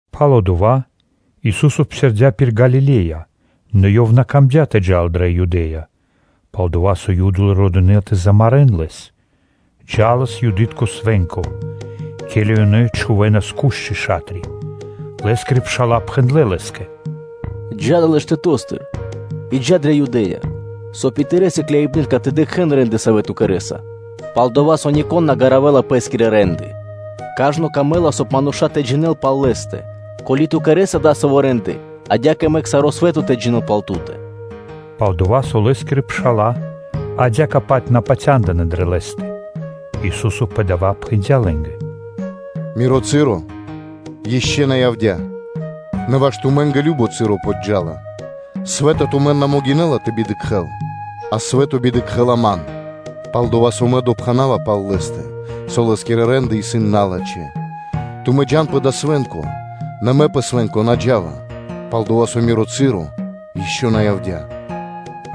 Пало́ дава́ Ису́со псирдя́ пир Галиле́я, нэ Ёв на камдя́ тэ джал дрэ Юдэ́я, пал-дова́ со Юды родынэ тэ замарэ́н Лэс. Джа́лас Юды́тко Свэ́нко, ке́ли ёнэ чхувэ́нас бу́ды (кушчы). Лэ́скирэ пша́ла пхэндлэ́ Лэ́скэ: “Джа́ далэ́ штэто́стыр и джа́ дрэ Юдэя, соб (кай) и Тырэ́ сыкляибны́тка тэ дыкхэ́н рэ́нды, савэ́ Ту кэрэ́са; пал-дова́ со нико́н на ґаравэла пэ́скирэ рэ́нды, кажно камэ́ла, соб (кай) мануша́ тэ джинэ́н пал лэ́стэ; ко́ли Ту кэрэ́са дасавэ́ рэ́нды, адя́кэ мэк саро́ свэ́то тэ джинэ́л пал Ту́тэ” (Пал-дова́ со Лэ́скирэ пша́ла адя́кэ-паць на патяндынэ́ дрэ Лэ́стэ). Ису́со пэ дава́ пхэндя́ лэ́нгэ: “Миро часо ишчо (инкэ́) на явдя́, нэ ваш тумэ́нгэ кажно часо подджа́ла. Свэ́то на могинэ́ла тэ бидыкхэл тумэн (тэ ненавидинэл), а свэ́то бидыкхэла Ман, пал-дова́ со Мэ допхэнава пал лэ́стэ, со лэ́скирэ рэ́нды исын налачхэ́. Тумэ́ джа́н пэ дава́ свэ́нко, нэ Мэ пэ свэ́нко на джа́ва, пал-дова́ со Миро часо ишчо (инкэ́) на явдя́.”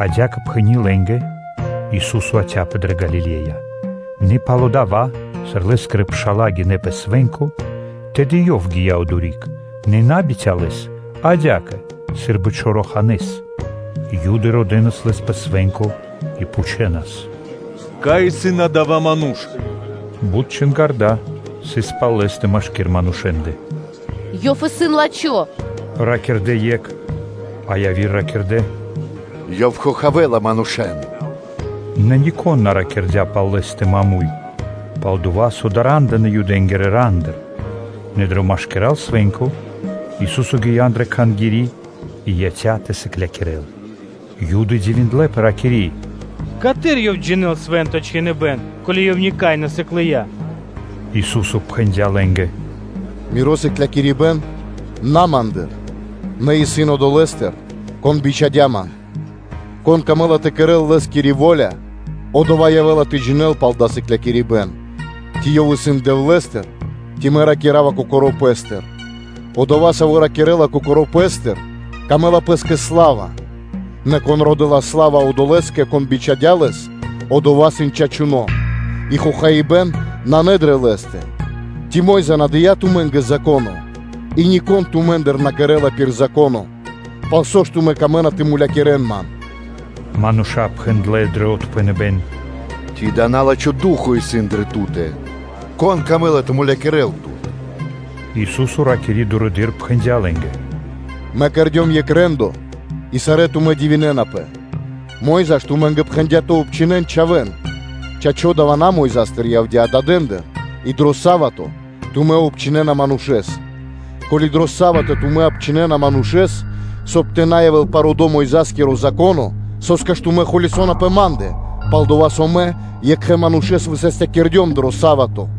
Адя́кэ пхэни́ лэ́нгэ, Ису́со яця́пэ дрэ Галиле́я. Нэ пало́ дава́, сыр Лэ́скирэ пша́ла гинэ́ пэ свэ́нко, тэды и Ёв гия́ одори́к, нэ на бицялэс, а адя́кэ, сы́рбы чораханэ́с. Юды родэнас Лэс пэ свэ́нко и пхучэнас: “Кай исын адава́ ману́ш.” Бут чингарда́ сыс пал Лэ́стэ машки́р манушэ́ндэ: “Ёв исын лачхо́ ману́ш,” – ракирдэ́ екх, а яви́р ракирдэ́: “Ёв хохавэла манушэ́н.” Нэ нико́н на ракирдя́ пал Лэ́стэ маму́й, пал-дова́ со дара́ндынэ Юдэ́нгирэ рандыр. Нэ дро машкира́л свэ́нко Ису́со гия́ андрэ́ Кхангири́ и яця́ тэ сыклякирэ́л. Юды дивиндлэ́пэ, ракири́: “Каты́р Ёв джинэ́ла Свэ́нто Чхиныбэ́н, ко́ли Ёв никай на сыклыя?” Ису́со пхэндя́ лэ́нгэ: “Миро сыклякирибэ́н исын на Ма́ндыр, нэ исын Одолэ́стыр, Кон бичхадя́ Ман. Кон камэ́ла тэ кэрэ́л Лэ́скири во́ля, одова́ явэ́ла тэ джинэ́л пал дава́ сыклякирибэ́н, ци ёв исын Дэвлэ́стыр, ци Мэ ракира́ва Кокоро́ Пэ́стыр. Одова́, саво́ ракирэ́ла кокоро́ пэ́стыр, мангэ́ла пэ́скэ сла́ва; нэ кон родэ́ла сла́ва Одолэ́скэ, кон бичхадя́ Лэс, Одова́ сын чачуно́, и хохаибэ́н нанэ дрэ Лэ́стэ. Ци Мо́йза на дыя́ тумэ́нгэ Зако́но? И нико́н тумэ́ндыр на кэрэ́ла пир Зако́но. Пал со ж тумэ́ камэ́на тэ мулякирэ́н Ман?” Мануша́ пхэндлэ́ дро отпхэныбэ́н: “Ци дава́ на́лачхо Ду́хо (Фа́но) исын дрэ Ту́тэ? Кон камэ́ла тэ мулякирэ́л Тут?” Ису́со ракири́ дурэды́р, пхэндя́ лэ́нгэ: “Мэ кэрдём екх рэ́ндо, и сарэ́ тумэ́ дивинэнапэ. Мо́йза ж тумэ́нгэ пхэндя́ тэ обчхинэн чхавэ́н (чачо́, дава́ на Мойзастыр явдя́, а дадэндыр), и дро са́вато (субо́та) тумэ́ обчхинэна манушэ́с. Ко́ли дро са́вато тумэ́ обчхинэна манушэ́с, соб (кай) тэ на явэ́л парудо Мойза́скиро Зако́но, со́скэ ж тумэ́ холясона пэ Ма́ндэ, пал-дова́, со Мэ екхэ манушэ́с высастякирдём дро са́вато?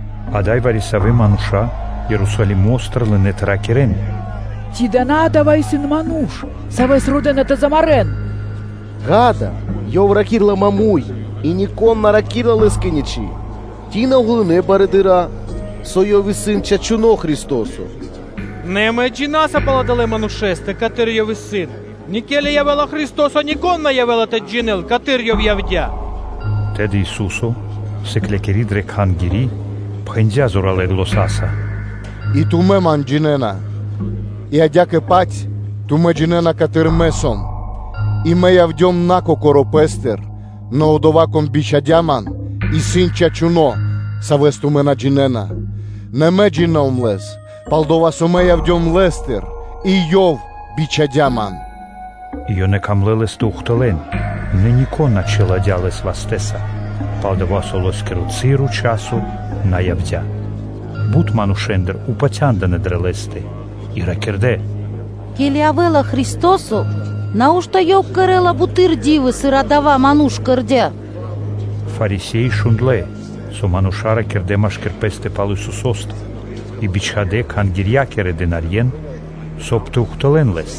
Ада́й вари-савэ́ мануша́ Ерусалимо́стыр лынэ́ тэ ракирэ́н: “Ци Адава́ исын Ману́ш, Савэс родэ́на тэ замарэ́н? Ѓа́да, Ёв ракирэ́ла муршканэ́с, и нико́н на ракирэ́ла Лэ́скэ ничы́. Ци на уґалынэ барыдыра́, со Ёв исын чачуно́ Христо́со? Нэ амэ джина́са пал адалэ́ манушэ́стэ, каты́р Ёв исын. Нэ ке́ли явэ́ла Христо́со, нико́н на явэ́ла тэ джинэ́л, каты́р Ёв явдя́.” Тэды Ису́со, сыклякири дрэ Кхангири́, пхэндя́ зоралэ́ заня́са: “И тумэ́ джинэ́на Ман и тумэ́ джинэ́на, каты́р Мэ сом; и Мэ явдём на Кокоро́ Пэ́стыр. Нэ Одова́, Кон бичхадя́ Ман, исын чачуно́, Савэс тумэ́ на джинэ́на. Нэ Мэ джино́м Лэс, пал-дова́ со Мэ явдём Лэ́стыр, и Ёв бичхадя́ Ман.” И ёнэ камлэ́ Лэс тэ ухтылэ́н, нэ нико́н на чиладя́ Лэс вастэ́са, пал-дова́ со Лэ́скиро часо на явдя́. Бут манушэ́ндыр упатя́ндынэ дрэ Лэ́стэ и ракирдэ́: “Ке́ли явэ́ла Христо́со, нау́што Ёв кэрэ́ла буты́р ди́вы, сыр Адава́ Ману́ш кэрдя́? Фарисе́и шундлэ́, со мануша́ ракирдэ́ холя́са машки́р пэ́стэ пал Исусо́стэ, и бичхадэ́ Кхангирья́кирэ стрэгарьен (стражникэн), соб (кай) тэ ухтылэ́н Лэс.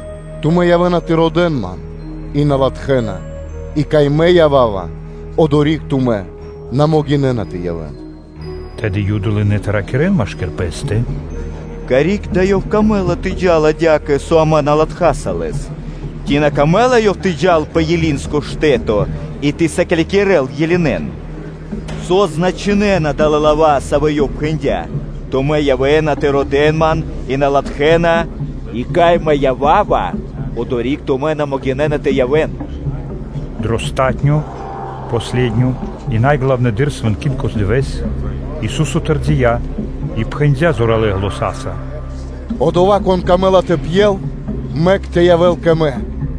Тумэ́ явэ́на тэ родэ́н Ман, и на латхэ́на; и кай Мэ ява́ва, одори́к тумэ́ на могинэ́на тэ явэ́н.” Тэды Юды лынэ́ тэ ракирэ́н машки́р пэ́стэ: “Карик да Ёв камэ́ла тэ джал адя́кэ, со амэ на латхаса Лэс? Ци на камэ́ла Ёв тэ джал пэ Элинэнгиро штэ́то и тэ сыклякирэ́л Елинэн (Грекэ́н / Баламэ́н)? Со значынэна далэ́ лава́, савэ́ Ёв пхэндя́: “Тумэ́ явэ́на тэ родэ́н Ман, и на латхэ́на: и кай Мэ ява́ва, одори́к тумэ́ на могинэ́на тэ явэ́н.” Дро палатуно́ (последнё) и са́мо главно свэнкитко дывэ́с, Ису́со тэрдия́ и пхэндя́ зоралэ́ заня́са: “Одова́, кон камэ́ла тэ пьел, мэк тэ явэ́л кэ Мэ.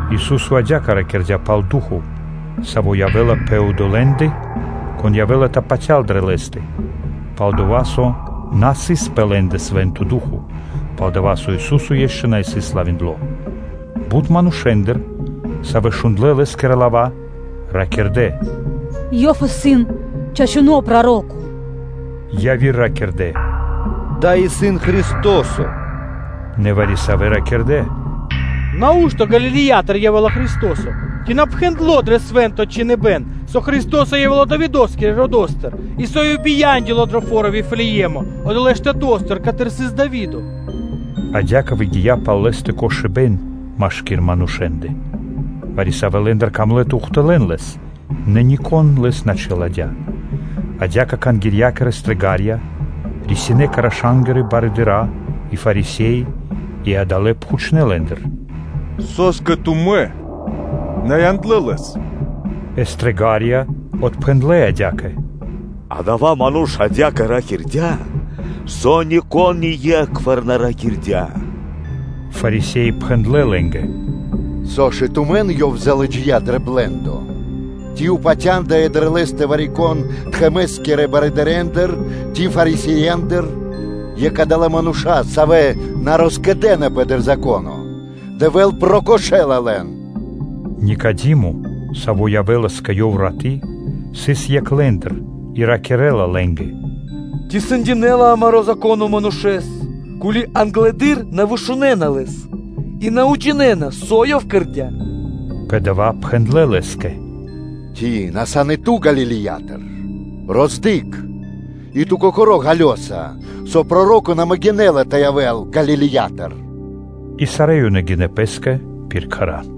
Ису́со адя́кэ ракирдя́ пал Ду́хо (Фа́но), саво́ явэ́ла тэ одолэ́ндэ, кон явэ́ла тэ патял дрэ Лэ́стэ; пал-дова́ со на сыс пэ лэ́ндэ Свэ́нто Ду́хо (Фа́но), пал-дова́ со Ису́со ишчо (инкэ́) на сыс славиндло. Бут манушэ́ндыр, савэ́ шундлэ́ Лэ́скирэ лава́, ракирдэ́: “Ёв исын чачуно́ Проро́ко.” Яви́р ракирдэ́: “Дава́ исын Христо́со”, нэ вари-савэ́ ракирдэ́: “Нау́што Галилеятыр явэ́ла Христо́со? Ци на пхэндло́ дрэ Свэ́нто Чхиныбэ́н, со Христо́со явэ́ла Давидо́скирэ родо́стыр, и со Ёв бияндёла дро фо́ро Вифлее́мо, одолэ́ штэто́стыр, каты́р сыс Дави́до?” Адя́кэ выгия́ пал Лэ́стэ кошыбэ́н машки́р манушэ́ндэ. Вари-савэ́ лэ́ндыр камлэ́ тэ ухтылэ́н Лэс; нэ нико́н Лэс на чиладя́. Адя́кэ Кхангирья́кирэ стрэгарья рисинэ́ кэ раша́нгирэ барыдыра́ и Фарисе́и, и адалэ́ пхучнэ́ лэ́ндыр: “Со́скэ тумэ́ на яндлэ́ Лэс?” Э стрэгарья отпхэндлэ́ адя́кэ: “Адава́ ману́ш адя́кэ ракирдя́, со нико́н ние́кхвар на ракирдя́.” Фарисе́и пхэндлэ́ лэ́нгэ: “Со ж и тумэн Ёв залыджия́ дро блэ́ндо? Ци упатяндыя дрэ Лэ́стэ вари-кон тхэмэ́скирэ барыдырэндыр ци Фарисеендыр? Екх адалэ́ мануша́, савэ́ на роскэдэнапэ дро Зако́но, Дэвэ́л прокошэла лэн.” Никадимо, саво́ явэ́лас кэ Ёв раты́, сыс екх лэ́ндыр и ракирэ́ла лэ́нгэ: “Ци сэндинэла амаро́ Зако́но манушэ́с, ко́ли англэды́р на вышунэна лэс и на уджинэна, со ёв кэрдя́?” Пэ дава́ пхэндлэ́ лэ́скэ: “Ци на сан и ту Галилиятыр? Роздыкх и ту кокоро́ ґалёса, со проро́ко на могинэ́ла тэ явэ́л Галилеятыр.” И сарэ́ ёнэ гинэ́ пэ́скэ пир кхэра́.